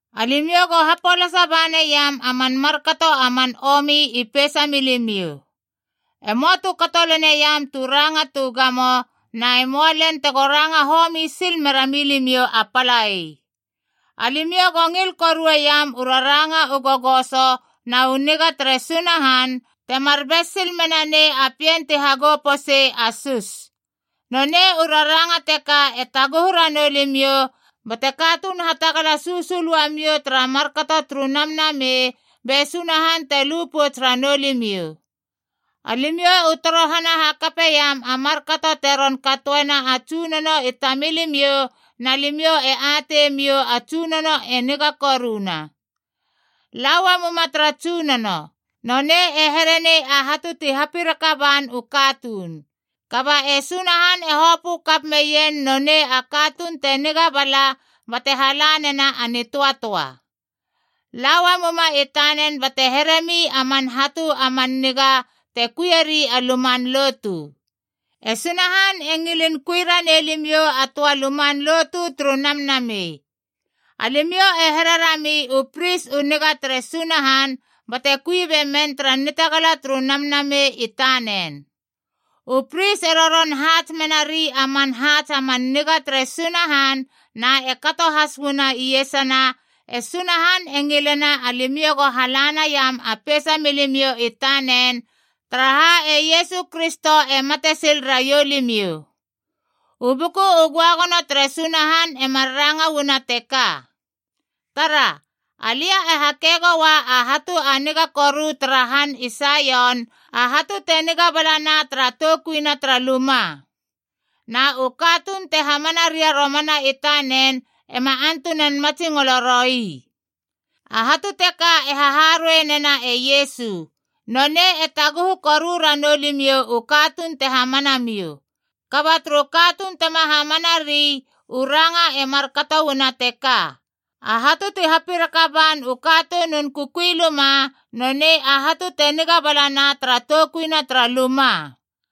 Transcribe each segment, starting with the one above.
Alimiou go hapolasa ba naiam a man markato a man omi i peisa milimiou. E möa tu kato leneiam tu ranga tu gamo, na e möa lel tego ranga homi sil mera milimiou a palai. Alimiou go ngil korueiam u raranga u gogoso na u niga tere Sunahan, temar bes sil mena nei a pien ti hagou posei a sus. Nonei u raranga teka e taguhu ranou limiou bate katuun hatagala susul uamiou tara markato turu Namnamei, be Sunahan te lu pouts ranou limiou. Alimiou u torohana hakapeiam a markato te ron katoena a Tsunono i tamilimiou, na limiou e atei miou a Tsunono e niga koruna. La uamuma tara Tsunono. Nonei e here nei a hatu ti hapiraka ban u katuun. Kaba e Sunahan e hopö kap meien nonei a katuun te niga bala, bate hala nena a nitöatöa. La uamuma i tanen bate heremi a man hatu a man niga te kuieri a luman lotu. E Sunahan e ngilin kui ranei limiou a töa luman lotu turu namnamei. Alimiou e here rami u pris u niga tere Sunahan bate kui be men tara nitagala turu Namnamei i tanen. U pris e roron haats menari a man haats a man niga tere Sunahan, na e kato has uana iesana, e Sunahan e ngilena alimiou go hala naiam a peisa milimiou i tanen, taraha e Iesu Kristo e mate sil raiou limiou. U Buku u Göagono tere Sunahan e mar ranga uana teka: “Tara. Alia e hake goua a hatu a niga koru tara han i Saion, a hatu te niga balana tara toukuina tara luma. Na u katuun te hamana ria romana i tanen ema antunan matsingolo roi.” A hatu teka e haharuei nena e Iesu. Nonei e taguhu koru ranou limiou u katuun te hamana miou. Kaba turu katuun tema hamanari, u ranga e markato uana teka, “A hatu ti hapiraka ban u katunun kukui luma, nonei a hatu te niga balana tara toukuina tara luma.”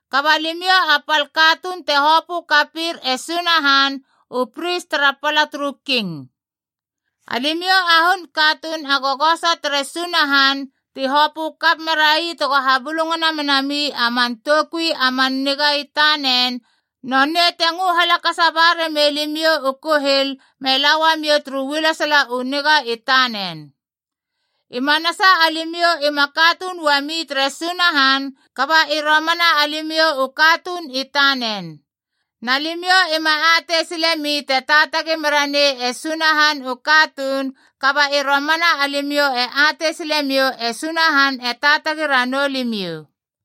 Kaba limiou a pal katuun te hopö kapir e Sunahan, u pris tara pala turu King. Alimiou a hun katuun a gogoso tere Sunahan ti hopö kap merai tego habulungana menami a man toukui a man niga i tanen, nonei te ngö halakasa ba ramei limiou u kuhil me la uamiou turu ualesala u niga i tanen. I manasa alimiou ima katuun uami tere Sunahan, kaba i romana alimiou u katuun i tanen. Na limiou ima atei silemi te taatagi mera nei e Sunahan u katuun, kaba i romana alimiou e atei silemiou e Sunahan e taatagi ranou limiou.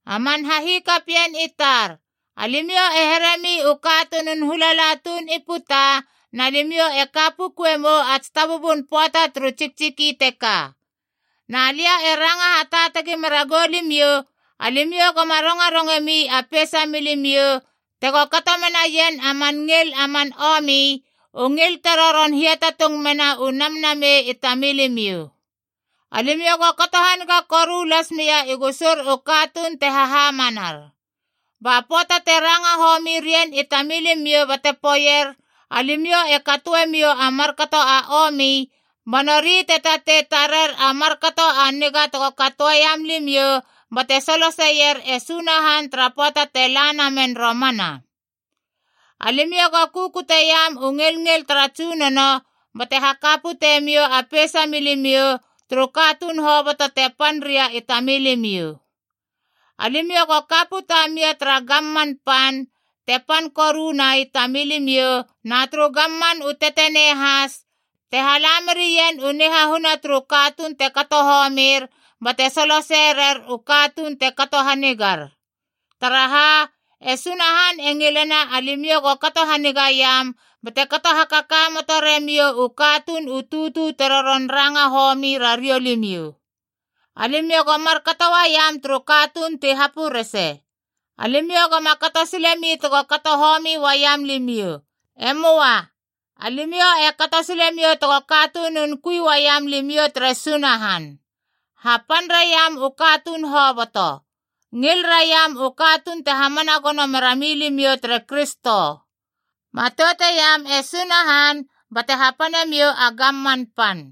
A man hahikapien i tar, alimiou e heremi u katunun hulala tuun i puta, na limiou e ka pukuemou a tsitabubun pöata turu tsiktsiki teka. Na lia e ranga hataatagi mera gilimiou, alimiou goma rongarongemi a peisa milimiou tego kato menaien a man ngil a man omi, u ngil te roron hiatatung mena u namnamei i tamilimiou. Alimiou go kato haniga koru las mia i gusur u katuun te hahamanar. Ba pöata te ranga homi rien i tamilimiou bate poeier alimiou e katoemiou a markato a omi, ba nori te tatei tarer a markato a niga tego katoeiam limiou, bate soloseier e Sunahan tara pöata te la namen romana. Alimiou go kukuteiam u ngilngil tara Tsunono bate haka pute miou a peisa milimiou turu katuun hoboto te pan ria i tamilimiou. Alimiou go ka puta mia tara gamman pan te pan koruna i tamilimiou, na turu gamman u tetenei has te hala merien u nihahuna turu katuun te kato homir bate solosei rer u katuun te kato hanigar. Taraha, e Sunahan e ngilena alimiou go kato hanigaiam bate kato hakakamoto remiou u katuun u tutu te roron ranga homi rariou limiou. Alimiou go markato uaiam turu katuun ti hapurese. Alimiou goma kato silemi tego kato homi uaiam limiou. E möa. Alimiou e kato silemiou tego katunun kui uaiam limiou tere Sunahan. Hapan raiam u katuun hoboto. Ngil raiam u katuun te hamana gono merami limiou tere Kristo. Matouteiam e Sunahan, bate hapanemiou a gamman pan.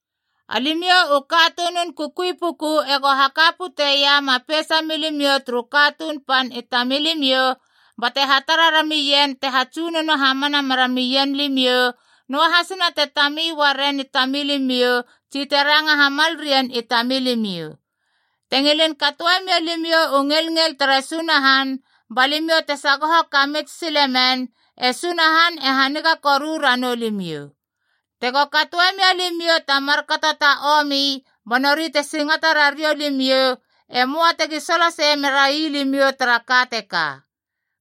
Alimiou u katunun kukui puku ego haka puteiam a peisa milimiou turu katuun pan i tamilimiou, bate hatara ramien te hatsunono hamana meramien limiou, noahasina te tami uaren i tamilimiou tsi te ranga hamal rien i tamilimiou. Te ngilin katoe mia limiou u ngilngil tere Sunahan ba limiou te sagoho kamits silemen, e Sunahan e haniga koru ranou limiou. Tego katoe mia limiou ta markato ta omi ba nori te singata rariou limiou, e möa tegi solosei merai limiou tara ka teka.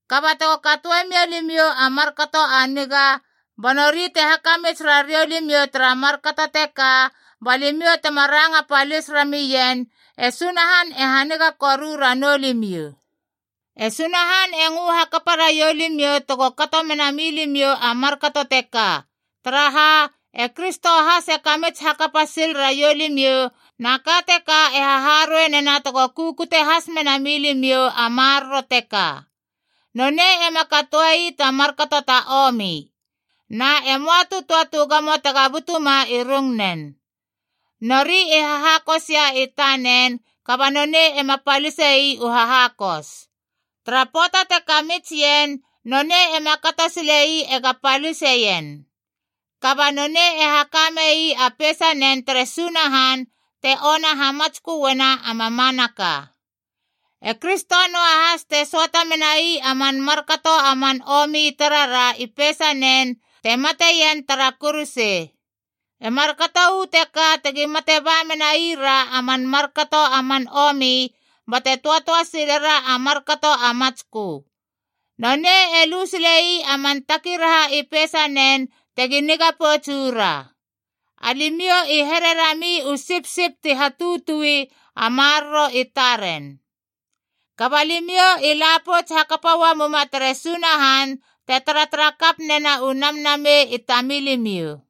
Kaba tego katoe mia limiou a markato a niga ba nori te hakamits rariou limiou tara markato teka, ba limiou tema ranga palis ramien, e Sunahan e haniga koru ranou limiou. E Sunahan e ngö hakapa raiou limiou tego kato mena milimiou a markato teka. Taraha, e Kristo has e kamits hakapa sil raiou limiou, na ka teka e haharuei nena tego kukute has mena mi limiou a maroro teka. “Nonei ema katoe ii ta markato ta omi. Na e möa tu töa tu gamo tega butuma i rungnen.” Nori i hahakosia i tanen kaba nonei ema palise ii u hahakos. Tara pöata te kamits ien, nonei ema kato sile ii ega paliseien. Kaba nonei e haka mei a peisanen tere Sunahan te ona hamatsköena a mamanaka. E Kristo noahas te söata menai a man markato a man omi i tarara i peisanen te mateien tara kuruse. E markato uu teka tegi mate ba menai ra a man markato a man omi bate töatöa silera a markato a matskö. Nonei e lu sile ii a man takiraha i peisanen tegi niga pouts uu ra. Alimiou i here rami u sipsip ti hatutui a maroro i taren. Kaba limiou i la pouts hakapa uamuma tere Sunahan te taratara kap nena u namnamei i tamilimiou.